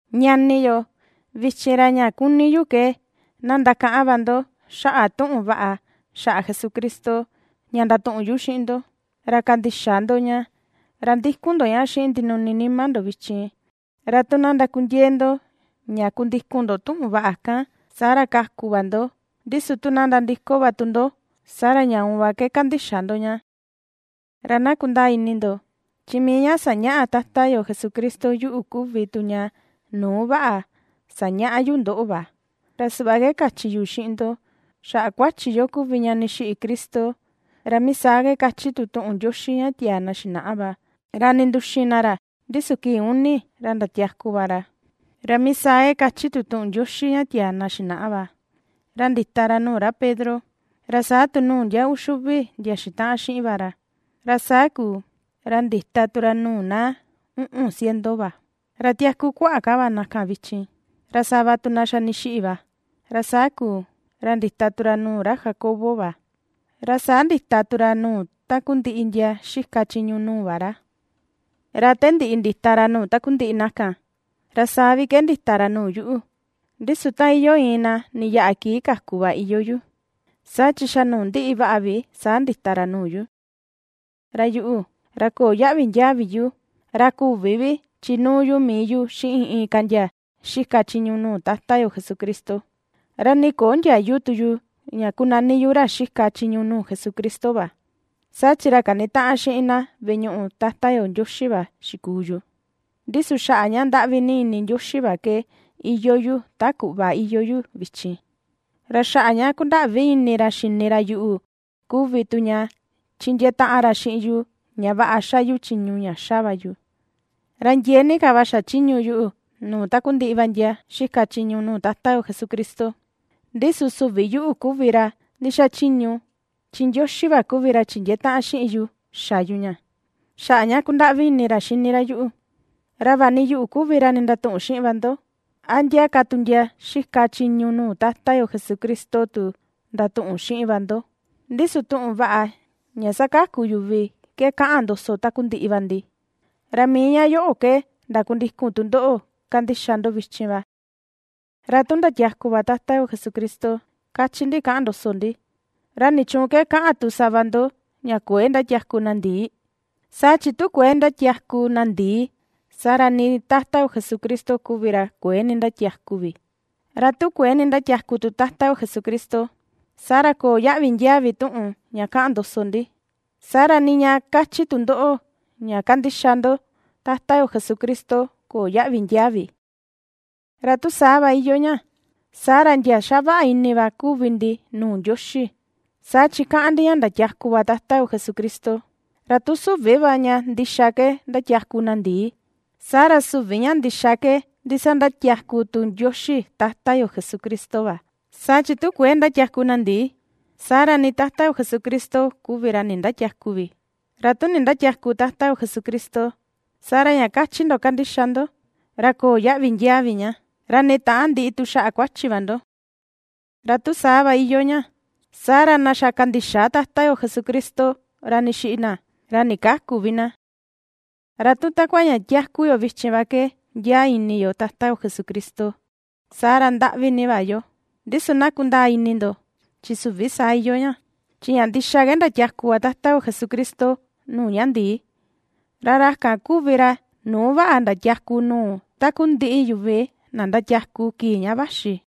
Ñani yo, vichin, ra ña kuni yu ke na ndakaꞌan va ndo xaꞌa tuꞌun vaꞌa xaꞌa Jesucristo ña ndatuꞌun yu xiꞌin ndo, ra kandixa ndo ña, ra ndikun ndo ña xiꞌin ndinuni nima ndo vichin. Ra tu na ndakundiee ndo ña kundikun ndo tuꞌun vaꞌa kan, saa ra kaku va ndo, ndi su tu na nandiko va tu ndo, saa ra ña uun va ke kandixa ndo ña. Ra na kundaa ini ndo, chi mii ña sañaꞌa Tata yo Jesucristo yuꞌu kuvi tu ña nuu vaꞌa sañaꞌa yu ndoꞌo va, ra suꞌva ke kachi yu xiꞌin ndo: Xaꞌa kuachi yo kuvi ña ndixiꞌi Cristo, ra mii saa ke kachi tu tuꞌun Ndioxi ña tiaa na xinaꞌa va; ra ninduxin na ra, ndi su kii uni ra ndatiaku va ra, ra mii saa ke kachi tu tuꞌun Ndioxi ña tiaa na xinaꞌa va; ra ndita ra nuu ra Pedro, ra saa tu nuu ndia uxi uvi ndia xitaꞌan xiꞌin va ra. Ra saa kuu, ra ndita tu ra nuu na uꞌun ciento va, ra tiaku kuaꞌa ka va na kan vichin, ra sava tu na xa ndixiꞌi va. Ra saa kuu, ra ndita tu ra nuu ra Jacobo va, ra saa ndita tu ra nuu takundiꞌi ka tu ndia xika chiñu nuu va ra. Ra ta ndiꞌi ndita ra nuu takundiꞌi na kan, ra saa vi ke ndita ra nuu yuꞌu, ndi su ta iyoo iin na ndiyaꞌa kii kaku va iyoo yu, saa chi xa nuu ndiꞌi vaꞌa vi saa ndita ra nuu yu. Ra yuꞌu, ra köo yaꞌvi ndiaa vi yu ra küvi vi ^chinuu yu mii yu xiꞌin inka ndia xika chiñu nuu Tata yo Jesucristo, ra nii köo ndiayu tu yu ña kunani yu ra xika chiñu nuu Jesucristo va, saa chi ra kanitaꞌan xiꞌin na veꞌe ñuꞌu Tata yo Ndioxi va xikuu yu. Ndi su xaꞌa ña ndaꞌvi ini Ndioxi va ke iyoo yu ta kuꞌva iyoo yu vichin, ra xaꞌa ña kundaꞌvi ini ra xini ra yuꞌu kuvi tu ña chindiee taꞌan ra xiꞌin yu ña vaꞌa xa yu chiñu ña xa va yu, ra ndiee ni ka va xachiñu yuꞌu nuu takundiꞌi va ndia xika chiñu nuu Tata yo Jesucristo; ndi su süvi yuꞌu kuvi ra ndixachiñu chi Ndioxi va kuvi ra chindiee taꞌan xiꞌin yu xa yu ña, xaꞌa ña ^kundaꞌvi ini ra yuꞌu. Ra vaꞌa ni yuꞌu kuvi ra ndatuꞌun xiꞌin va ndo, a ndia ka tu ndia xika chiñu nuu Tata yo Jesucristo tu ndatuꞌun xiꞌin va ndo; ndi su tuꞌun vaꞌa ña ^sakaku yuvi ke kaꞌan ndoso takundiꞌi va ndi, ra mii ña yoꞌo ke ndakundikun tu ndoꞌo kandixa ndo vichin va. Ra tu ndatiaku va Tata yo Jesucristo, kachi ndi kaꞌan ndoso ndi, ¿ra nichuun ke kaꞌan tu sava ndo ña kuëe ^ndatiaku na ndii? Saa chi tu kuëe ndatiaku na ndii, saa ra nii Tata yo Jesucristo kuvi ra kuëe nindatiaku vi; ra tu nindatiäku tu Tata yo Jesucristo, saa ra köo yaꞌvi ndiaa vi tuꞌun ña kaꞌan ndoso ndi, saa ra nii ña kachi tu ndoꞌo ña kandixa ndo Tata yo Jesucristo köo yaꞌvi ndiaa vi. Ra tu saa va iyoo ña, saa ra ndia ^xavaꞌa ini va kuvi ndi nuu Ndioxi, saa chi kaꞌan ndi ña sandatiaku va ra Tata yo Jesucristo; ra tu süvi va ña ndixa ke ^ndatiaku na ndii, saa ra süvi ña ndixa ke ndisandatiaku tu Ndioxi Tata yo Jesucristo va. Saa chi tu kuëe ^ndatiaku na ndii, saa ra ni Tata yo Jesucristo kuvi ra nindatiäku vi; ra tu nindatiäku Tata yo Jesucristo, saa ra ña kachi ndo kandixa ndo, ra köo yaꞌvi ndiaa vi ña; ra nii täan ndiꞌi tu xaꞌa kuachi va ndo. Ra tu saa va iyoo ña, saa ra na xa kandixa Tata yo Jesucristo, ra ndixiꞌi na, ra ndikäku vi na. Ra tu takua ña tiaku yo vichin va ke ndiaa ini yo Tata yo Jesucristo, saa ra, ndaꞌvi ni va yo. Ndi su na kundaa ini ndo chi süvi saa iyoo ña, chi ña ndixa ke ndiatiaku va Tata yo Jesucristo nuu ña ndii; ra ra kan kuvi ra nuu vaꞌa ndatiaku nuu takundiꞌi yuvi na ndatiaku kii ña vaxi.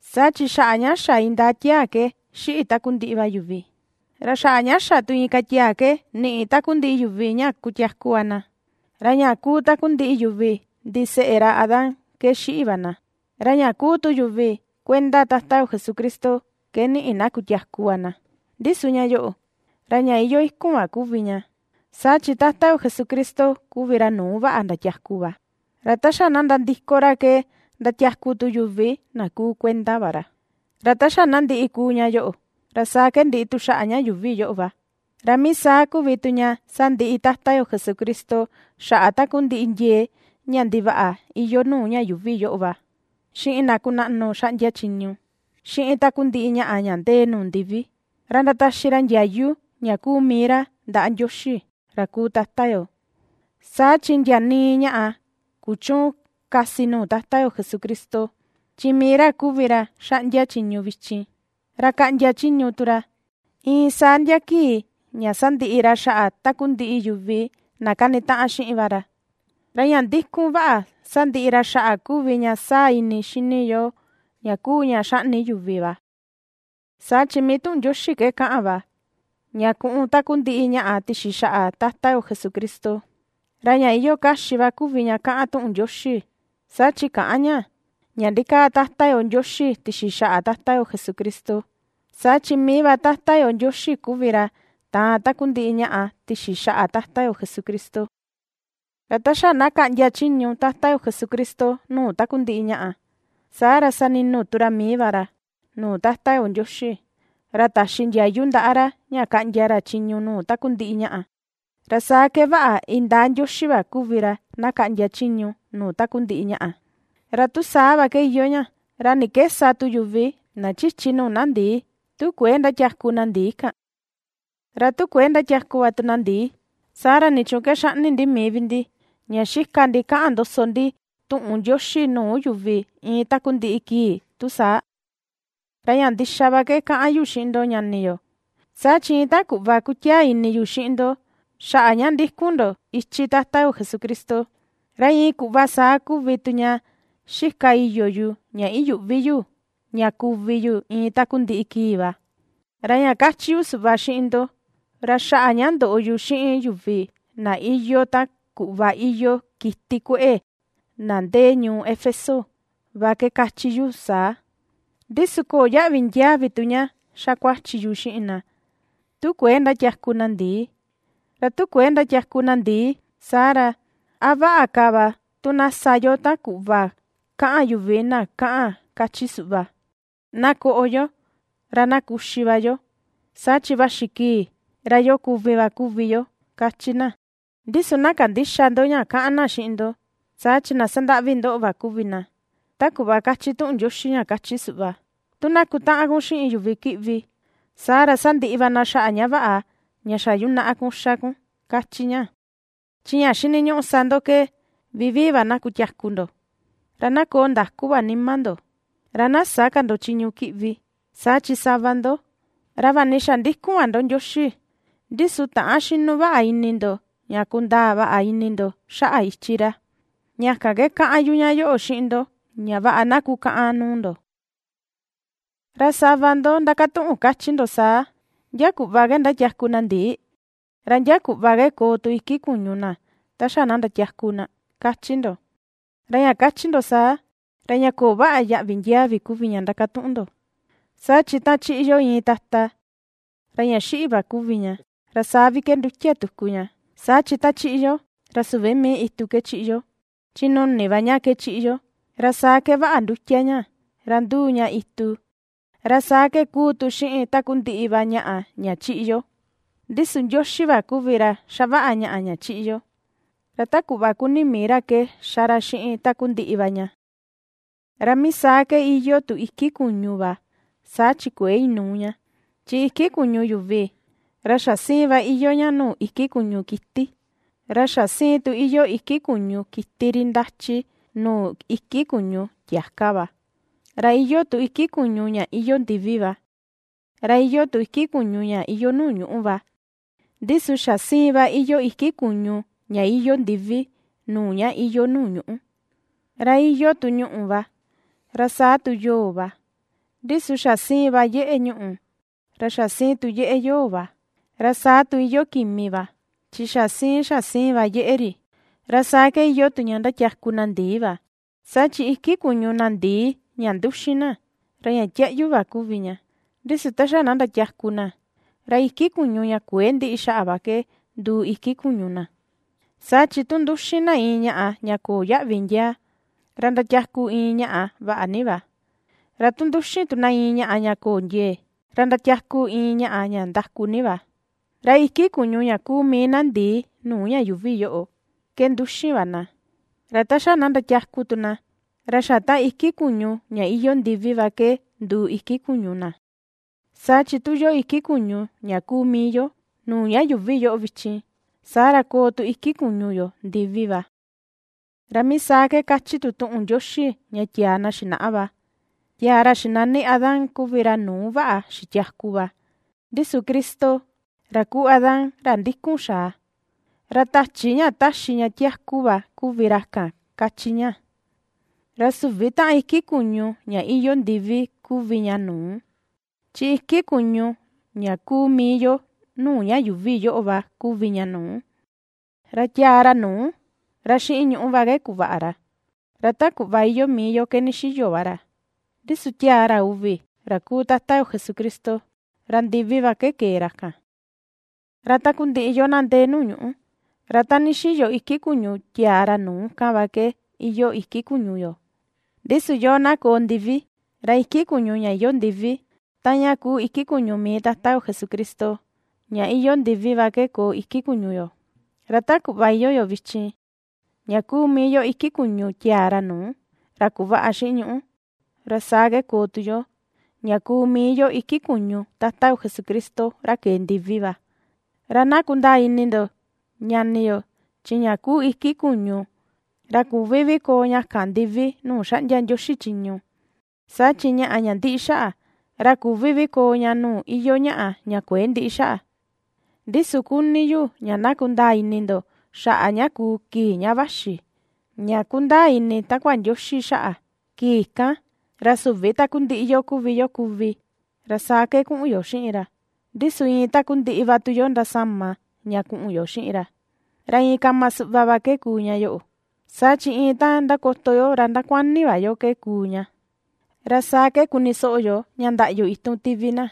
Saa chi xaꞌa ña xa indaa tiaa ke ^xiꞌi takundiꞌi va yuvi, ra xaꞌa ña xa tu inka tiaa ke niꞌi tu takundiꞌi yuvi ña ndatiaku va na. Ra ña kuu takundiꞌi yuvi ndiseꞌe ra Adán ke xiꞌi va na, ra ña kuu tu yuvi kuenda Tata yo Jesucristo ke niꞌi na kutiaku va na. Ndi su ña yoꞌo, ra ña iyoo ikun va kuvi ña, saa chi Tata yo Jesucristo kuvi ra nuu vaꞌa ndatiaku va, ra ta xa na nandiko ra ke ndatiaku tu yuvi na kuu kuenda va ra. Ra ta xa na ndiꞌi kuu ña yoꞌo, ra saa ke ndiꞌi tu xaꞌa ña yuuvi yoꞌo va, ra mii saa kuvi tu ña sandiꞌi Tata yo Jesucristo xaꞌa takundiꞌi ndiee ña ndivaꞌa iyoo nuu ña yuuvi yoꞌo va, xiꞌin na kunaꞌnu xaꞌndia chiñu, xiꞌin takundiꞌi ñaꞌa ña ndee nuu ndivi, ra ndataxi ra ndiayu ña kuu mii ra ndaꞌa Ndioxi ra kuu Tata yo. Saa chi ndia nii ñaꞌa kuchüun kasi nuu Tata yo Jesucristo, chi mii ra kuvi ra ^xaꞌndia chiñu vichin, ra kaꞌndia chiñu tu ra, iin saa ndia kii ña sandiꞌi ra xaꞌa takundiꞌi yuvi na kanitaꞌan xiꞌin va ra; ra ña ndi̱ku̱n vaꞌa sandiꞌi ra xaꞌa kuvi ña saa ini xini yoo, ña kuu ña xaꞌni yuvi va. Saa chi mii tuꞌun Ndioxi ke kaꞌan va ña kuꞌun takundiꞌi ñaꞌa tixi xaꞌa Tata yo Jesucristo, ra ña iyoo kaxi va kuvi ña kaꞌan tuꞌun Ndioxi, saa chi käꞌan ña ña ndikaa Tata yo Ndioxi tixi xaꞌa Tata yo Jesucristo, saa chi mii va Tata yo Ndioxi kuvi ra taan takundiꞌi ñaꞌa tixi xaꞌa Tata yo Jesucristo. Ra ta xa na kaꞌndia chiñu Tata yo Jesucristo nuu takundiꞌi ñaꞌa, saa ra sani̱nu̱ tu ra mii va ra, nuu Tata yo Ndioxi, ra taxi ndiayu ndaꞌa ra ña kaꞌndia ra chiñu nuu takundiꞌi ñaꞌa. Ra saa ke vaꞌa indaa Ndioxi va kuvi ra na kaꞌndia chiñu nuu takundiꞌi ñaꞌa. Ra tu saa va ke iyoo ña, ¿ra ni ke sa tu yuvi na chichi nuu na ndii, tu kuëe ndatiaku na ndii kan? ¿Ra tu kuëe ndatiaku va tu na ndii, saa ra nichuun ke xaꞌni ndi mii vi ndi ña xika ndi kaꞌan ndoso ndi tuꞌun Ndioxi nuu yuvi iin takundiꞌi kii tu saa? Ra ña ndixa va ke ^kaꞌan yu xiꞌin ndo ñani yo, saa chi iin ta kuꞌva kutiaa ini yu xiꞌin ndo xaꞌa ña ^ndíku̱n ndo ichi Tata yo Jesucristo, ra iin kuꞌva saa kuvi tu ña xika iyo yu ña iyuꞌvi yu ña kuvi yu iin takundiꞌi kii va. Ra ña kachi yu suꞌva xiꞌin ndo, ra xaꞌa ña ndoꞌo yu xiꞌin yuvi na iyoo ta kuꞌva iyoo kiti kueꞌe na ndee ñuu Éfeso va ke kachi yu saa; ndi su köo yaꞌvi ndiaa vi tu ña ^xa kuachi yu xiꞌin na, tu kuëe ndatiaku na ndii. Ra tu kuëe ndatiaku na ndii, saa ra, ¿a vaꞌa ka va tu na sa yo ta kuꞌva kaꞌan yuvi na kaꞌan kachi suꞌva?: “Na koꞌo yo, ra na kuxi va yo, saa chi vaxi kii ra yo kuvi va kuvi yo”, kachi na. Ndi su na kandïxa ndo ña kaꞌan na xiꞌin ndo, saa chi na sandaꞌvi ndoꞌo va kuvi na. Ta kuꞌva kachi tuꞌun ndichi ña kachi suꞌva: “Tu na kutaꞌan kun xiꞌin yuvi kiꞌvi, saa ra sandiꞌi va na xaꞌa ña vaꞌa ña xa yunaꞌa kun ^xa kun, kachi ña.” Chi ña xiniñuꞌu sa ndo ke vivii va na kutiaku ndo, ra na koo ndaku va nima ndo, ra na sä ka ndo chiñu kiꞌvi, saa chi sava ndo, ra vaꞌa ni xa ndikun va ndo Ndioxi, ndi su täan xinu vaꞌa ini ndo ña kundaa vaꞌa ini ndo xaꞌa ichi ra. Ña kan ke kaꞌan yu ña yoꞌo xiꞌin ndo ña vaꞌa na kukaꞌan nuu ndo. Ra sava ndo ^ndakatuꞌun kachi ndo saa: “¿Ndia kuꞌva ke ndatiaku na ndii? ¿Ra ndia kuꞌva ke koo tu iki kuñu na ta xa na ndatiaku na?”, kachi ndo. Ra ña kachi ndo saa, ra ña köo vaꞌa yaꞌvi ndiaa vi kuvi ña ndakatuꞌun ndo, saa chi ta chiꞌi yo iin tata, ra ña xiꞌi va kuvi ña, ra saa vi ke ^ndutia tuku ña. Saa chi ta chiꞌi yo, ra süvi mii itu ke chiꞌi yo, chi nuni va ña ke chiꞌi yo, ra saa ke vaꞌa ndutia ña, ra nduu ña itu, ra saa ke kuu tu xiꞌin takundiꞌi va ñaꞌa ña chiꞌi yo. Ndi su Ndioxi va kuvi ra xavaꞌa ñaꞌa ña chiꞌi yo, ra ta kuꞌva kuni mii ra ke ^xa ra xiꞌin takundiꞌi va ña. Ra mii saa ke iyoo tu iki kuñu va, saa chi kuëe inuu ña, chi iki kuñu yuvi, ra xa siin va iyoo ña nuu iki kuñu kiti; ra xa siin tu iyoo iki kuñu kiti ri ndachi nuu iki kuñu tiaka va. Ra iyoo tu iki kuñu ña iyoo ndivi va, ra iyoo tu iki kuñu ña iyoo nuu ñuꞌú va, ndi su xa siin va iyoo iki kuñu ña iyoo ndivi nuu ña iyoo nuu ñuꞌú. Ra iyoo tu ñuꞌù va, ra saa tu yo̱o̱ va, ndi su xa siin va yeꞌe ñuꞌù, ra xa siꞌin tu yeꞌe yo̱o̱ va, ra saa tu iyoo kimi va chi xa siin xa siin va yeꞌe ri. Ra saa ke iyoo tu ña ndatiaku na ndii va. Saa chi iki kuñu na ndii ña nduxin na, ra ña tiaꞌyu va kuvi ña, ndi su ta xa na ndatiaku na ra iki kuñu ña kuëe ndiꞌi xaꞌa va ke nduu iki kuñu na. Saa chi tu nduxin na iin ñaꞌa ña köo yaꞌvi ndiaa, ra ndatiaku iin ñaꞌa vaꞌa ni va. Ra tu nduxin tu na iin ñaꞌa ña köo ndiee, ra ndatiaku iin ñaꞌa ña ndaku ni va. Ra iki kuñu ña kuu mii na ndii nuu ña yuuvi yoꞌo ke nduxin va na, ra ta xa na ndatiaku tu na, ra xa taꞌan iki kuñu ña iyoo ndivi va ke nduu iki kuñu na. Saa chi tu iyoo iki kuñu ña kuu mii yo nuu ña yuuvi yoꞌo vichin, saa ra koo tu iki kuñu yo ndivi va. Ra mii saa ke kachi tu tuꞌun Ndioxi ña tiaa na xinaꞌa va: “Tiaa ra xinani Adán kuvi ra nuu vaꞌa xitiaku va”; ndi su Cristo, ra kuu Adán, ra ndikun xaa, ra tachi ña taxi ña tiaku va kuvi ra kan, kachi ña. Ra süvi taꞌan iki kuñu ña iyoo ndivi kuvi ña nuu; chi iki kuñu ña kuu mii yo nuu ña yuuvi yoꞌo va kuvi ña nuu. Ra tiaa ra nuu, ra xiꞌin ñuꞌu va ke kuvaꞌa ra, ra ta kuꞌva iyoo mii yo ke ndixiyo va ra; ndi su tiaa ra uvi ra kuu Tata yo Jesucristo, ra ndivi va ke kee ra kan. Ra takundiꞌi yoo na ndee nuu ñuꞌu, ra ta ndixiyo iki kuñu tiaa ra nuu kan va ke iyoo iki kuñu yo; ndi su yoo na koo ndivi ra iki kuñu ña iyoo ndivi taꞌan ña kuu mii iki kuñu Tata yo Jesucristo ña iyoo ndivi va ke koo iki kuñu yo. Ra ta kuꞌva iyoo yo vichin ña kuu mii yo iki kuñu tiaa ra nuu, ra kuvaꞌa xiꞌin ñuꞌu, ra saa ke koo tu yo, ña kuu mii yo iki kuñu Tata yo Jesucristo ra kee ndivi va. Ra na kundaa ini ndo, ñani yo, chi ña kuu iki kuñu, ra küvi vi koo ña kan ndivi nuu xaꞌndia Ndioxi chiñu; saa chi ñaꞌa ña ndiꞌi xaꞌa, ra küvi vi koo ña nuu iyoo ñaꞌa ña kuëe ndiꞌi xaꞌa. Ndi su kuni yu ña na kundaa ini ndo xaꞌa ña kuu, kii ña vaxi, ña kundaa ini takua Ndioxi xaꞌa: kii kan, ra süvi takundiꞌi yo kuvi yo kuvi, ra saa ke kuꞌun yo xiꞌin ra; ndi su iin takundiꞌi va tu yo ndasama ña kuꞌun yo xiꞌin ra. Ra iin kama suꞌva va ke kuu ña yoꞌo, saa chi iin ta ndakoto yo ra ndakuani va yo ke kuu ña, ra saa ke kuni soꞌo yo ña ndaꞌyu itun tivi na,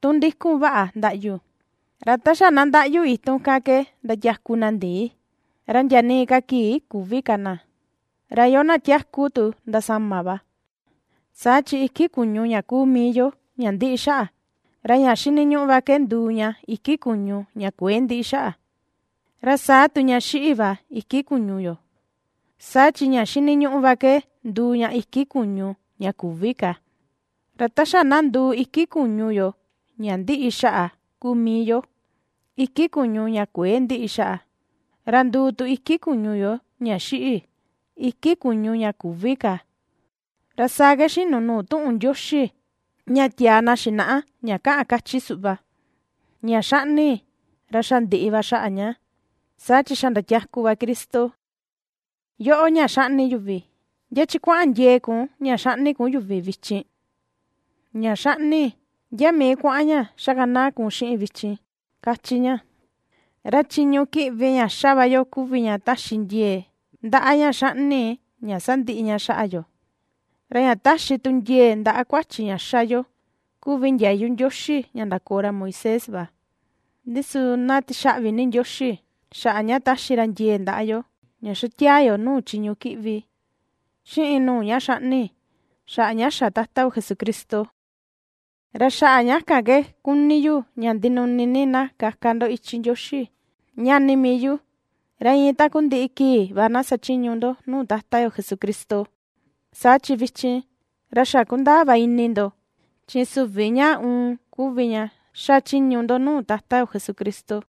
tu ndikun vaꞌa ndaꞌyu, ra ta xa na ndaꞌyu itun kan ke ndatiaku na ndii, ra ndia nii ka kii küvi ka na; ra yoo na tiaku tu ndasama va. Saa chi iki kuñu ña kuu mii yo ña ndiꞌi xaꞌa, ra ña xiniñuꞌu va ke nduu ña iki kuñu ña kuëe ndiꞌi xaꞌa; ra saa tu ña xiꞌi va iki kuñu yo, saa chi ña xiniñuꞌu va ke nduu ña iki kuñu ña küvi ka. Ra ta xa na nduu iki kuñu yo ña ndiꞌi xaꞌa kuu mii yo, iki kuñu ña kuëe ndiꞌi xaꞌa, ra nduu tu iki kuñu yo ña xiꞌi, iki kuñu ña küvi ka, ra saa ke xinu nuu tuꞌun Ndioxi ña tiaa na xinaꞌa ña kaꞌan, kachi suꞌva: “Ña xaꞌni, ra xa ndiꞌi va xaꞌa ña, saa chi xa ndiatiaku va Cristo. Yóꞌo̱, ña xaꞌni yuvi, ¿ndia chi kuaꞌan ndiee kun ña xaꞌni yuvi vichin? Ña xaꞌni, ¿ndia mii kuaꞌan ña xakanaa kun xiꞌin vichin?”, kachi ña. Ra chiñu kiꞌvi ña ^xa va yo kuvi ña taxi ndiee ndaꞌa ña xaꞌni ña sandiꞌi ña xaꞌa yo, ra ña taxi tu ndiee ndaꞌa kuachi ña xa yo kuvi ndiayu Ndioxi ña ndakoo ra Moisés va. Ndi su na tixaꞌvi ni Ndioxi, xaꞌa ña ^taxi ra ndiee ndaꞌa yo ña xa tiaa yo nuu chiñu kiꞌvi xiꞌin nuu ña xaꞌni, xaꞌa ña xa Tata yo Jesucristo. Ra xaꞌa ña kan ke kuni yu ña ndinuni ni na kaka ndo ichi Ndioxi, ñani mii yu, ra iin takundiꞌi kii va na sachiñu ndo nuu Tata yo Jesucristo; saa chi vichin, ra xa ^kundaa va ini ndo, chi süvi ña uun kuvi ña xachiñu ndo nuu Tata yo Jesucristo.